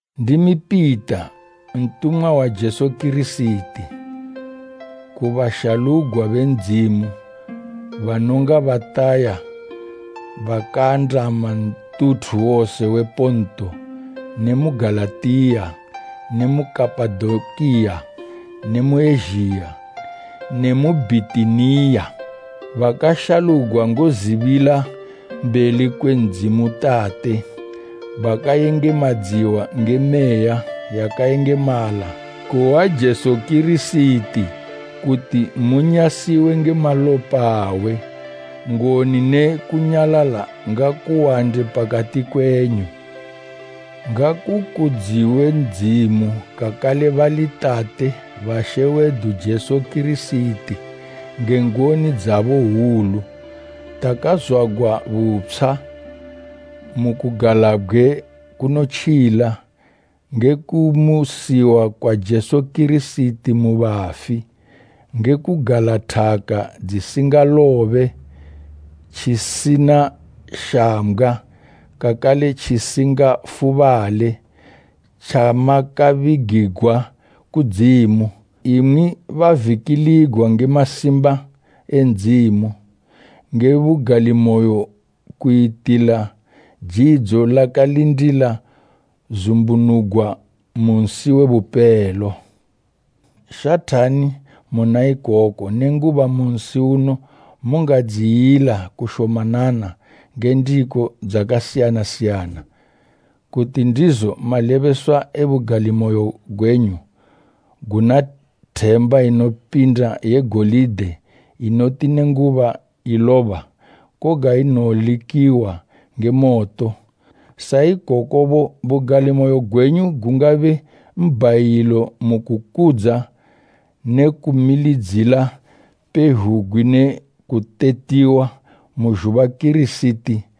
Ndimi Pita, ntumwa wa Jesu Kirisiti. Ku bashalugwa be Ndzimu banonga bataya bakaandama ntuthu wose we Ponto ne mu Galatiya ne mu Kapadokiya ne mu Ezhiya ne mu Bhitiniya, bakashalugwa ngozibila mbeli kwe Ndzimu Tate, bakayengemadziwa nge Meya yakayengemala, kuhwa Jesu Kirisiti kuti munyasiwe nge malopa awe: Ngoni ne kunyalala ngakuwande pakati kwenyu. Ngakukudziwe Ndzimu kakale bali Tate ba She wedu Jesu Kirisiti! Nge ngoni dzabo hwulu, takazwagwa butshwa mu kugalabgwe kunotjila, nge kumusiwa kwa Jesu Kirisiti mu bafi, ngekugala thaka tjisingalobe, tjisina shambgwa, kakale tjisingafubale, tjamakabigigwa kudzimu, imwi bavikiligwa nge masimba e Ndzimu, nge bugalimoyo kuyitila jidzo lakalindila zumbunugwa mu nsi we bupelo. Shathani muna ikoku, nenguba mu nsi uno mungadziyila kushomanana nge ndiko dzakasiyana siyana, kuti ndizo malebeswa e bugalimoyo gwenyu guna themba inopinda ye golide inoti nenguba iloba, koga inolikiwa nge moto, sa ikokobo bugalimoyo gwenyu gungabe mbhayilo mu kukudza ne kumilidzila pezhugwi ne kutetiwa mu kuzumbunugwa kwa Jesu Kirisiti.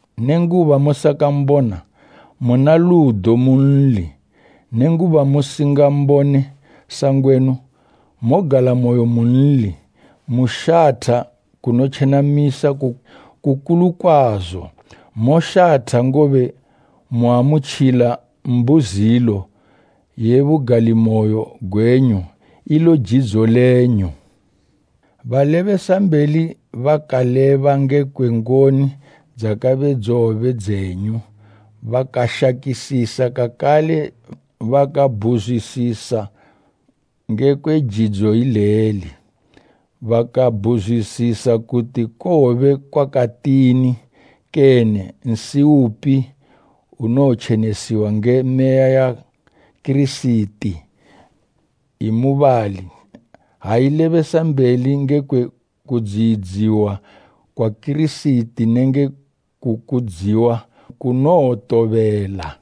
Nenguba musakambona, muna ludo munli, nenguba musingambone sangwenu mogalamoyo munli, mushatha kunotjenamisa, kukulu kwazo. Moshatha ngobe muamutjila mbuzilo ye bugalimoyo gwenyu, ilo jidzo lenyu. Balebesambeli bakaleba ngekwe ngoni dzakabe dzowobe dzenyu, bakashakisisa kakale bakabhuzwisisa ngekwe jidzo ileli. Bakabhuzwisisa kuti kowobe kwakatini kene nsi upi unotjenesiwa nge meya ya Kirisiti imubali, ha ilebesambeli ngekwe kudziyidziwa kwa Kirisiti nenge kukudziwa kunowotobela.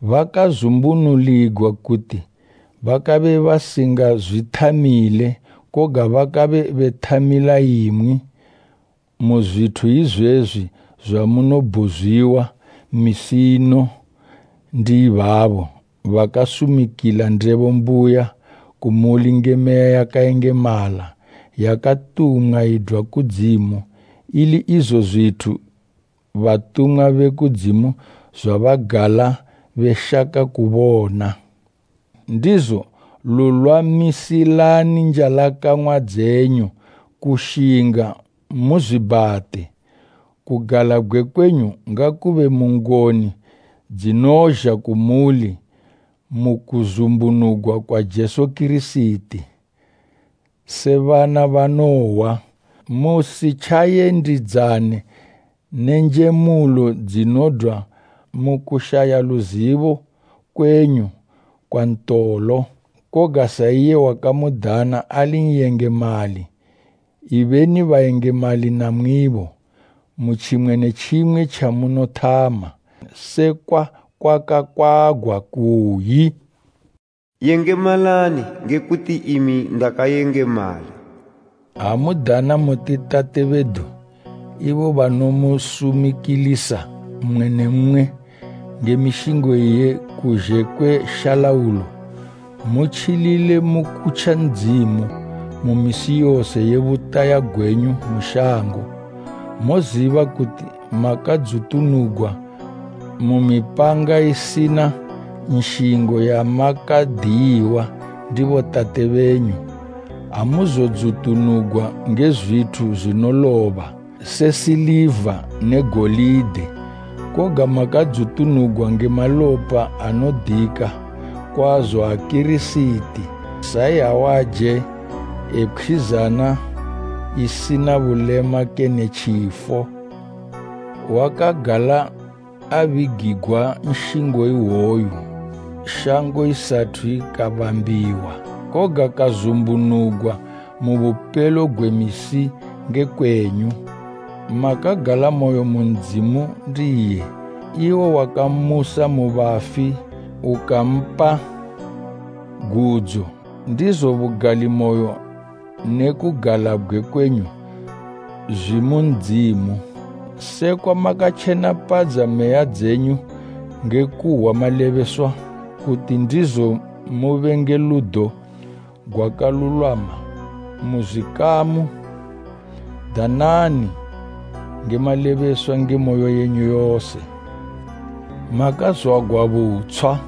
Bakazumbunuligwa kuti bakabe basingazwithamile, koga bakabe bethamila imwi, mu zwithu izwezwi zwamunobudziwa misi ino ndi ibabo bakasumikila ndebo mbuya kumuli nge Meya yakayengemala yakatumwa idwa kudzimu, ili izo zwithu batumwa be kudzimu zwabagala beshaka kubona. Ndizo, lulwamisani njalakang'wa dzenyu kushinga, muzwibhate. Kugalabgwe kwenyu ngakube mu ngoni dzinozha kumuli mu kuzumbunugwa kwa Jesu Kirisiti. Se bana banohwa, musitjayendidzane ne njemulo dzinodwa mu kushaya luzibo kwenyu kwa ntolo. Koga, sa iye wakamudana ali n'yengemali, ibeni bayengemali namwibo, mu tjimwe ne tjimwe tjamunothama; sekwa kwakakwagwa, kuyi “Yengemalani, nge kuti imi ndakayengemala.” Ha mudana muti Tate bedu, ibo banosumikilisa mmwe ne mmwe nge mishingo iye kuzhe kwe shalaulo, mutjilile mu kutja Ndzimu mu misi yose ye butaya gwenyu mu shango. Moziba kuti makadzutunugwa mu mipanga isina nshingo yamakadiyiwa ndi botate benyu. Amuzodzutunugwa nge zwithu zwinoloba se siliva ne golide, koga makadzutunugwa nge malopa anodika kwazo a Kirisiti, sa iyawaje e pkhwizana isina bulema kene tjifo. Wakagala abigigwa nshingo iwoyu shango isathu ikabambiwa, koga kazumbunugwa mu bupelo gwe misi nge kwenyu. Makagalamoyo mu Ndzimu ndiye, iwo wakammusa mu bafi ukampa gudzo, ndizo bugalimoyo ne kugalabgwe kwenyu zwimu Ndzimu. Sekwa makatjenapadza meya dzenyu nge kuhwa malebeswa, kuti ndizo mube nge ludo gwakalulwama mu zwikamu, danani nge malebeswa nge moyo yenyu yose. Makazwagwa butshwa,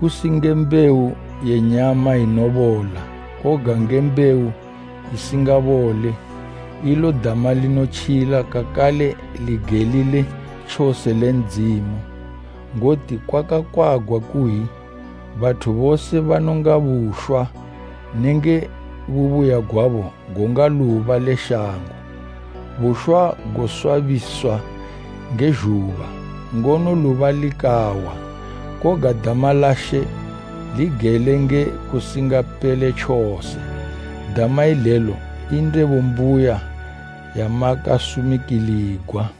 kusi nge mbewu ye nyama inobola, koga nge mbewu isingabole, ilo dama linotjila kakale ligelile tjose le Ndzimu. Ngoti kwakakwagwa kuyi, “Bathu bose banonga bushwa, nenge bubuya gwabo gonga luba le shango. Bushwa goswabiswa nge zhuba, ngono luba likawa, koga dama la She ligele nge kusingapele tjose.” Dama ilelo i ndebo mbuya yamakasumikiligwa.